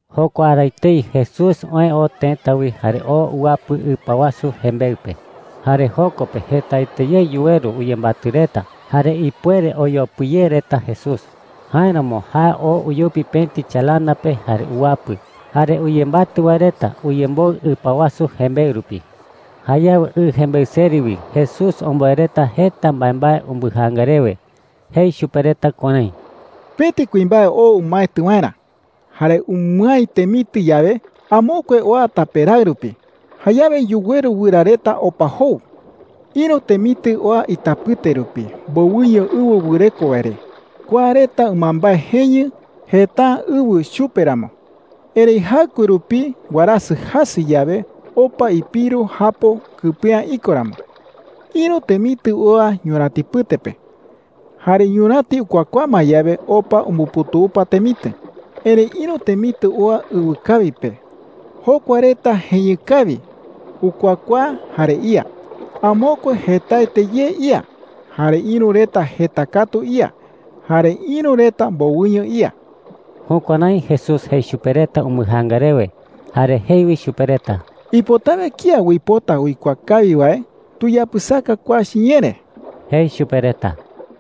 Jokua ara etei Jesús oë oo tëta wi jare oo uwapɨ ɨpa wasu jembeɨ pe. Jare joko pe jetaete ye yuweru uyembatɨ reta jare ipuere oyopɨ ye reta Jesús. Jáeramo jae oo uyupi pëti chalana pe jare uwapɨ. Jare uyembatɨ wae reta uyemboɨ ɨpa wasu jembeɨ rupi. Jayawe ɨ jembeɨ seri wi Jesús omboe reta jeta mbaembae umbɨjaanga rewe. Jei chupe reta kuärái: “Pëti kuimbae oo umaetɨ waerä. Jare umɨái temitɨ yawe, amokue oa tape raɨ rupi. Jayawe yuweru wɨra reta opa jou,” jei chupe reta. “Ïru temitɨ oa itapɨte rupi mbowɨño ɨwɨ wɨreko wae re. Kua reta ɨmambae jeñɨ, jeta’ä ɨwɨ chupe ramo. Erëi jaɨkue rupi warasɨ jasɨ yawe, opa ipiru japo kɨpe’ä iko ramo,” jei. “Ïru temitɨ oa ñurätipɨte pe. Jare ñuräti ukuakuaa ma yawe, opa umbuputupa temitɨ,” jei. “Erëi ïru temitɨ oa ɨwɨkawi pe. Jokua reta jeñɨ kawi, ukuakuaa, jare ía. Amokue jetaete ye ía, jare ïru reta jeta katu ía, jare ïru reta mbowɨño ía.” Jukuärái Jesús jei chupe reta umbɨjaanga rewe. Jare jei wi chupe reta: “Ipotawe kía uipota uikuaa kawi wae, tuyapɨsaka kua chiñee re,” jei chupe reta.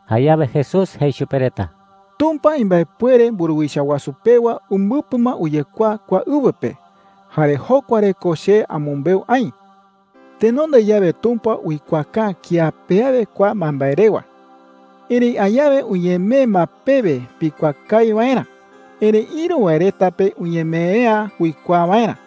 Jayawe Jesús jei chupe reta: “Tumpa imbaepuere mburuwicha wasu pewa umbɨpɨ ma uyekuaa kua ɨwɨ pe. Jare jokua re ko che amɨmbeu aï,” jei. “Tenonde yawe Tumpa uikuaaka’ä kía pe awe kua mbaembae rewa. Erëi añawe uñemee ma pewe pikuaa kawi waerä. Erëi ïru wae reta pe uñemee’ä uikuaa waerä.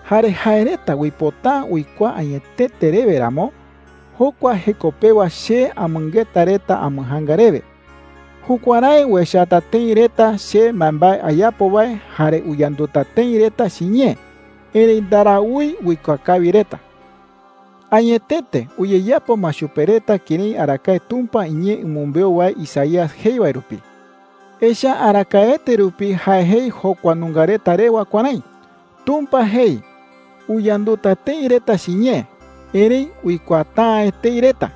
“Jare jae reta uipota’ä uikuaa añetete rewe ramo, jokua jeko pewa che amɨngeta reta ambɨjaanga rewe. Jukuärái uechata tëi reta che mbaembae ayapo wae jare uyanduta tëi reta chiñee, erëi ndaraúi uikuaa kawi reta,” jei. “Añetete, uyeyapo ma chupe reta kërái arakae Tumpa iñee umɨmbeu wae Isaías jei wae rupi. Echa’ä arakaete rupi jae jei jokua nunga reta rewa kuärái: “Tumpa jei: ‘Uyanduta tëi reta chiñee, erëi uikuaata’ä etei reta.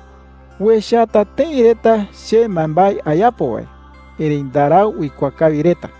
Uechata tëi reta che mbaembae ayapo wae, erëi ndarau uikuaa kawi reta.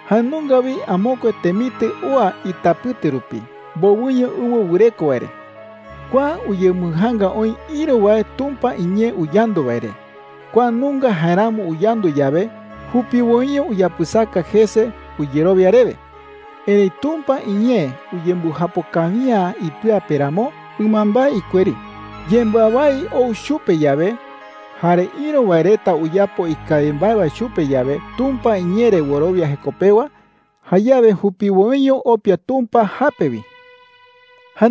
“Jae nunga wi amokue temitɨ oa itapɨte rupi mbowɨño ɨwɨ wɨreko wae re,” jei. “Kua uyembɨjaanga oï ïru wae Tumpa iñee uyandu wae re. Kua nunga jaeramo uyandu yawe, jupiwoiño uyapɨsaka jese uyerowia rewe,” jei. “Erëi Tumpa iñee uyembɨjapo kawi’ä ipɨa pe ramo, ɨmambae ikueri. Yembɨawái ou chupe yawe, jare ïru wae reta uyapo ikawi mbae wae chupe yawe Tumpa iñee re wɨrowia jeko pewa, jayawe jupiwoiño opia Tumpa jape wi,” jei chupe reta.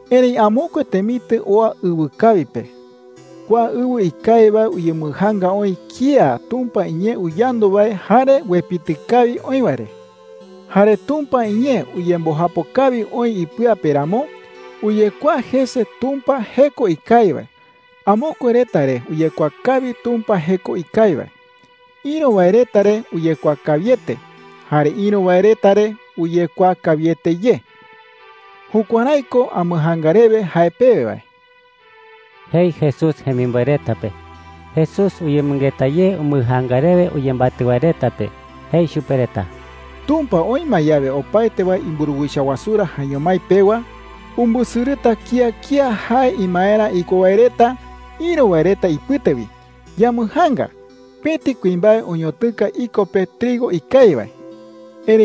“Erëi amokue temitɨ oa ɨwɨkawi pe. Kua ɨwɨ ikawi wae uyembɨjaanga oï kía Tumpa iñee uyandu wae jare uepitɨ kawi oï wae re,” jei. “Jare Tumpa iñee uyembɨjapo kawi oï ipɨa pe ramo, uyekuaa jese Tumpa jeko ikawi wae. Amokue reta re uyekuaa kawi Tumpa jeko ikawi wae. Ïru wae reta re uyekuaa kawiete, jare ïru wae reta re uyekuaa kawiete ye,” jei. “Jukuärái ko ambɨjaanga rewe jae pewe wae,” jei Jesús jemimboe reta pe. Jesús uyemɨngeta ye umbɨjaanga rewe uyembatɨ wae reta pe. Jei chupe reta: “Tumpa oï ma yawe opaete wae imburuwicha wasurä jaeño mái pewa, umbɨsɨrɨta kía kía jae imaerä iko wae reta ïru wae reta ipɨte wi. Yambɨjaanga. Pëti kuimbae oñotɨka iko pe trigo ikawi wae,” jei.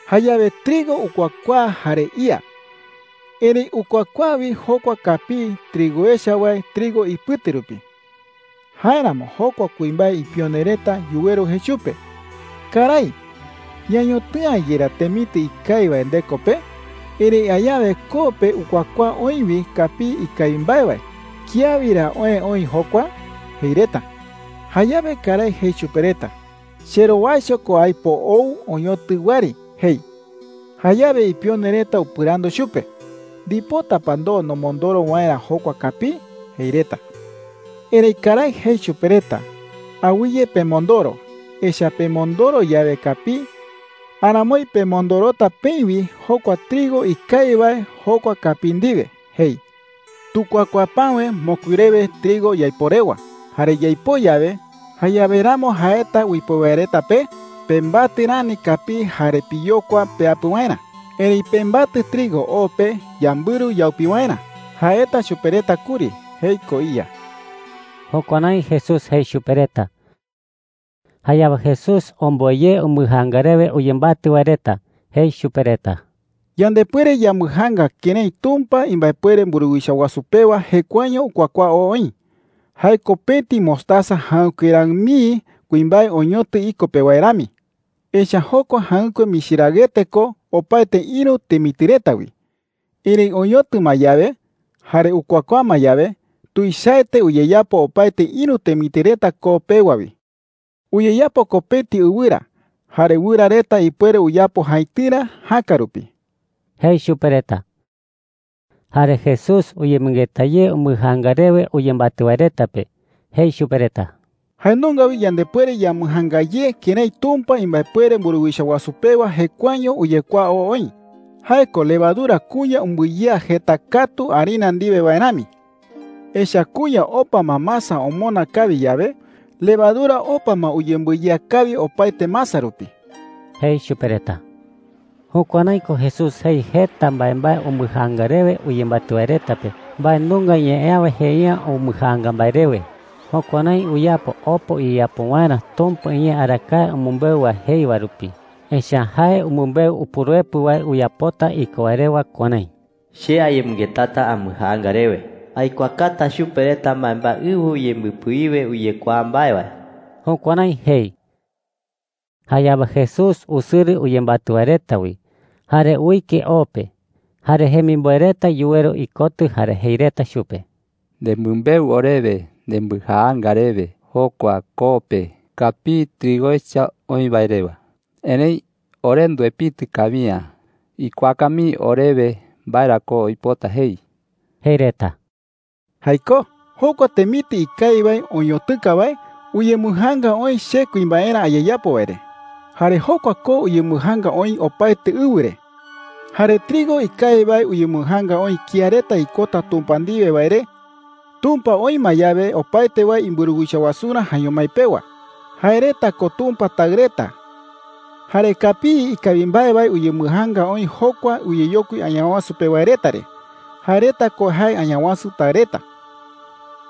“Jayawe trigo ukuakuaa jare ía. Erëi ukuakuaa wi jokua kapii trigo echa wae trigo ipɨte rupi,” jei. “Jáeramo jokua kuimbae ipione reta yuweru jei chupe: ‘Karái, ¿ñañotɨ'ä yerá temitɨ ikawi wae ndeko pe? Erëi añawe koo pe ukuakuaa oï wi kapii ikawi mbae wae. ¿Kía wi ra oë oï jokua?’ jei reta,” jei. “Jayawe karái jei chupe reta: ‘Cherowaicho ko aipo ou oñotɨ wɨari,’ jei. “Jayawe ipione reta upɨrandu chupe: “¿Ndipota pa ndoo nomondoro waerä jokua kapii?’ jei reta. “Erëi karái jei chupe reta: ‘Awɨye pemondoro. Echa’ä pemondoro yawe kapii, aramoi pemondorota peï wi jokua trigo ikawi wae jokua kapii ndiwe,’ jei. ‘Tukuakuaa päwe mokui rewe trigo yaipoo rewa. Jare yaipoo yawe, jayawe ramo jaeta uipoo wae reta pe, ‘Pembatɨ rani kapii jare piyokua peapɨ waerä. Erëi pembatɨ trigo o pe yambɨru yaupi waerä,’ jaeta chupe reta kuri,’ jei koo iya.” Jukuärái Jesús jei chupe reta. Jayawe Jesús omboe ye umbɨjaanga rewe uyembatɨ wae reta. Jei chupe reta: “Yandepuere yambɨjaanga kërái Tumpa imbaepuere mburuwicha wasu pewa jekuaeño ukuakuaa oo oï. Jae ko pëti mostaza jäɨkue raɨ mii kuimbae oñotɨ iko pe wae rami,” jei. “Echa’ä jokua jäɨkue michi raɨete ko opaete ïru temitɨ reta wi. Erëi oñotɨ ma yawe, jare ukuakuaa ma yawe, tuichaete uyeyapo opaete ïru temitɨ reta koo pewa wi. Uyeyapo ko pëti ɨwɨra. Jare wɨra reta ipuere uyapo jaitɨrä jäka rupi,” jei chupe reta. Jare Jesús uyemɨngeta ye umbɨjaanga rewe uyembatɨ wae reta pe. Jei chupe reta: “Jae nunga wi yandepuere yambɨjaanga ye kërái Tumpa imbaepuere mburuwicha wasu pewa jekuaeño uyekuaa oo oï. Jae ko levadura kuña umbɨyea jeta katu harina ndiwe wae rami,” jei. “Echa’ä kuña opa ma masa omona kawi yawe, levadura opa ma uyembɨyea kawi opaete masa rupi,” jei chupe reta. Jukuärái ko Jesús jei jeta mbaembae umbɨjaanga rewe uyembatɨ wae reta pe. Mbae nunga ñee awe jei’ä umbɨjaanga mbae rewe. Jukuärái uyapo opa uyeyapo waerä Tumpa iñee arakae umɨmbeu wae jei wae rupi. Echa’ä jae umɨmbeu Upuruepɨ wae uyapota iko wae rewa kuärái: “Che ayemɨngetata ambɨjaanga rewe. Aikuaakata chupe reta mbaembae ɨwɨ uyembɨpɨ wiwe uyekuaa mbae wae.” Jukuärái jei. Jayawe Jesús usɨrɨ uyembatɨ wae reta wi, jare uike o pe. Jare jemimboe reta yuweru ikotɨ jare jei reta chupe: “Nemɨmbeu orewe nembɨjaanga rewe jokua koo pe kapii trigo echa oï wae rewa. Erëi ore nduepitɨ kawi’ä. Ikuaaka mii orewe mbae ra ko uipota jei,” jei reta. “Jaikó,” jei Jesús. “Jokua temitɨ ikawi wae oñotɨka wae uyembɨjaanga oï che kuimbaerä ayeyapo wae re,” jei. “Jare jokua koo uyembɨjaanga oï opaete ɨwɨ re. Jare trigo ikawi wae uyembɨjaanga oï kía reta ikota Tumpa ndiwe wae re, Tumpa oï ma yawe opaete wae imburuwicha wasurä jaeño mái pewa. Jae reta ko Tumpa taɨ reta. Jare kapii ikawi mbae wae uyembɨjaanga oï jokua uyeyokui Añawasu pe wae reta re. Jae reta ko jae Añawasu taɨ reta.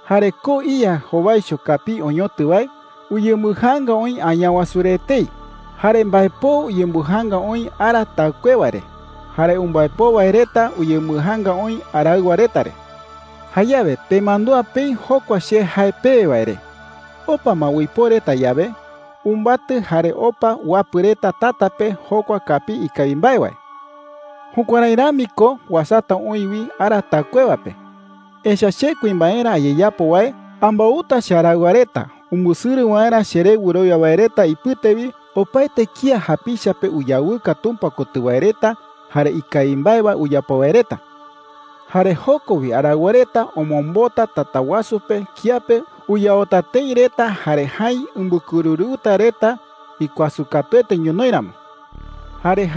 Jare koo iya jowaicho kapii oñotɨ wae uyembɨjaanga oï Añawasu re etei. Jare mbaepoo uyembɨjaanga oï ara taɨkuewa re. Jare umbaepoo wae reta uyembɨjaanga oï araɨwa reta re,” jei chupe reta. “Jayawe pemandúa peï jokua che jae pewe wae re. Opa ma uipoo reta yawe, umbatɨ jare opa uapɨ reta tata pe jokua kapii ikawi mbae wae. Jukuärái rami ko uasata oï wi ara taɨkuewa pe,” jei. “Echa’ä che kuimbaerä ayeyapo wae ambouta chearaɨwa reta umbɨsɨrɨ waerä cheré wɨrowia wae reta ipɨte wi opaete kía japicha pe uyawɨka Tumpa kotɨ wae reta jare ikawi mbae wae uyapo wae reta,” jei. “Jare joko wi araɨwa reta omombota tata wasu pe kiape uyaota tëi reta jare jäi umbɨkɨrɨrɨuta reta ikuasɨ katuete ñonoï ramo,” jei.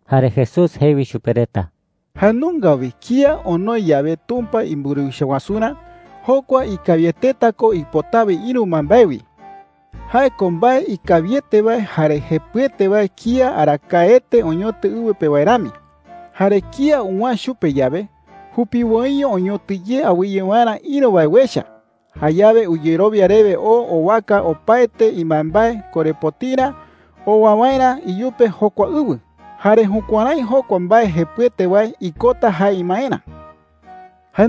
Jare Jesús jei wi chupe reta: “Jae nunga wi kía onoi yawe Tumpa imburuwicha wasurä, jokua ikawieteta ko ipotawe ïru mbaembae wi. Jae ko mbae ikawiete wae jare jepɨete wae kía arakaete oñotɨ ɨwɨ pe wae rami,” jei. “Jare kía uwäe chupe yawe, jupiwoiño oñotɨ ye awɨye waerä ïru wae uecha. Jayawe uyerowia rewe oo owaka opaete imbaembae korepotirä owa waerä iyupe jokua ɨwɨ. Jare jukuärái jokua mbae jepɨete wae ikota jae imaerä,” jei chupe reta.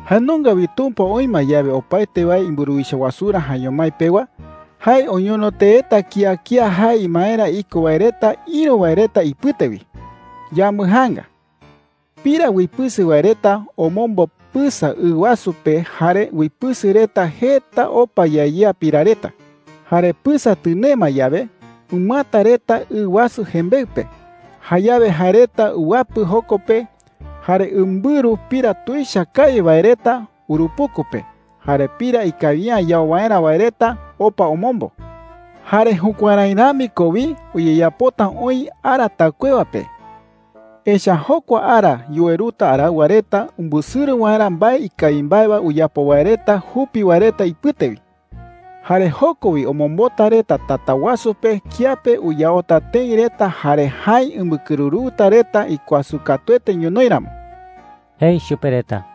“Jae nunga wi Tumpa oï ma yawe opaete wae imburuwicha wasurä jaeño mái pewa, jae oñono teeta kía kía jae imaerä iko wae reta ïru wae reta ipɨte wi. Yambɨjaanga. Pira uipɨsɨ wae reta omombo pɨsa ɨ wasu pe jare uipɨsɨ reta jeta opa yea yea pira reta,” jei. “Jare pɨsa tɨnee ma yawe, umɨata reta ɨ wasu jembeɨ pe. Jayawe jae reta uwapɨ joko pe jare umbɨru pira tuicha kawi wae reta urupuku pe, jare pira ikawi’ä yau waerä wae reta opa omombo,” jei. “Jare jukuärái rami ko wi uyeyapota oï ara taɨkuewa pe. Echa’ä jokua ara yuweruta araɨwa reta umbɨsɨrɨ waerä mbae ikawi mbae wae uyapo wae reta jupi wae reta ipɨte wi,” jei. “Jare joko wi omombota reta tata wasu pe kiape uyaota tëi reta jare jäi umbɨkɨrɨrɨuta reta ikuasɨ katuete ñonoï ramo,” jei chupe reta.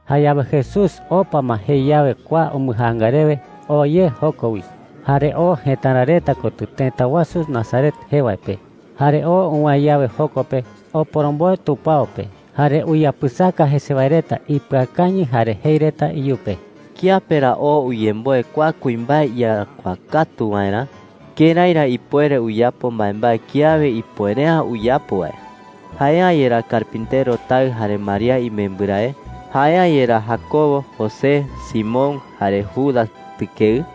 Jayawe Jesús opa ma jei yawe kua umbɨjaanga rewe, oo ye joko wi. Jare oo jëtara reta kotɨ, tëta wasu Nazaret jee wae pe. Jare oo uwäe yawe joko pe, oporomboe tupao pe. Jare uyapɨsaka jese wae reta ipɨakañɨ jare jei reta iyupe: “¿Kiape ra oo uyemboe kua kuimbae iyarakuaa katu waerä? ¿Kërái ra ipuere uyapo mbaembae kiawe ipuere’ä uyapo wae?” jei reta. “¿Jae’ä yerá carpintero taɨ jare María imembɨrae? ¿Jae’ä yerá Jacobo, José, Simón, jare Judas tɨkeɨ?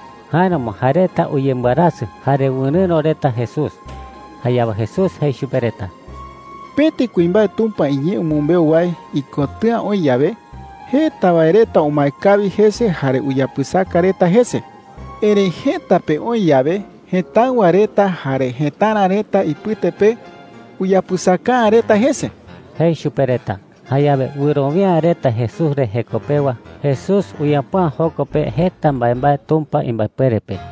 Jáeramo jae reta uyembɨarasɨ jare wɨrɨ̈ro reta Jesús. Jayawe Jesús jei chupe reta: “Pëti kuimbae Tumpa iñee umɨmbeu wae ikotɨ̈a oï yawe, jeta wae reta umae kawi jese jare uyapɨsaka reta jese,” jei. “Erëi jëta pe oï yawe jëtáɨwa reta jare jëtara reta ipɨte pe, uyapɨsaka’ä reta jese,” jei chupe reta. Jayawe wɨrowia’ä reta Jesús re jeko pewa, Jesús uyapo’ä joko pe jeta mbaembae Tumpa imbaepuere pe.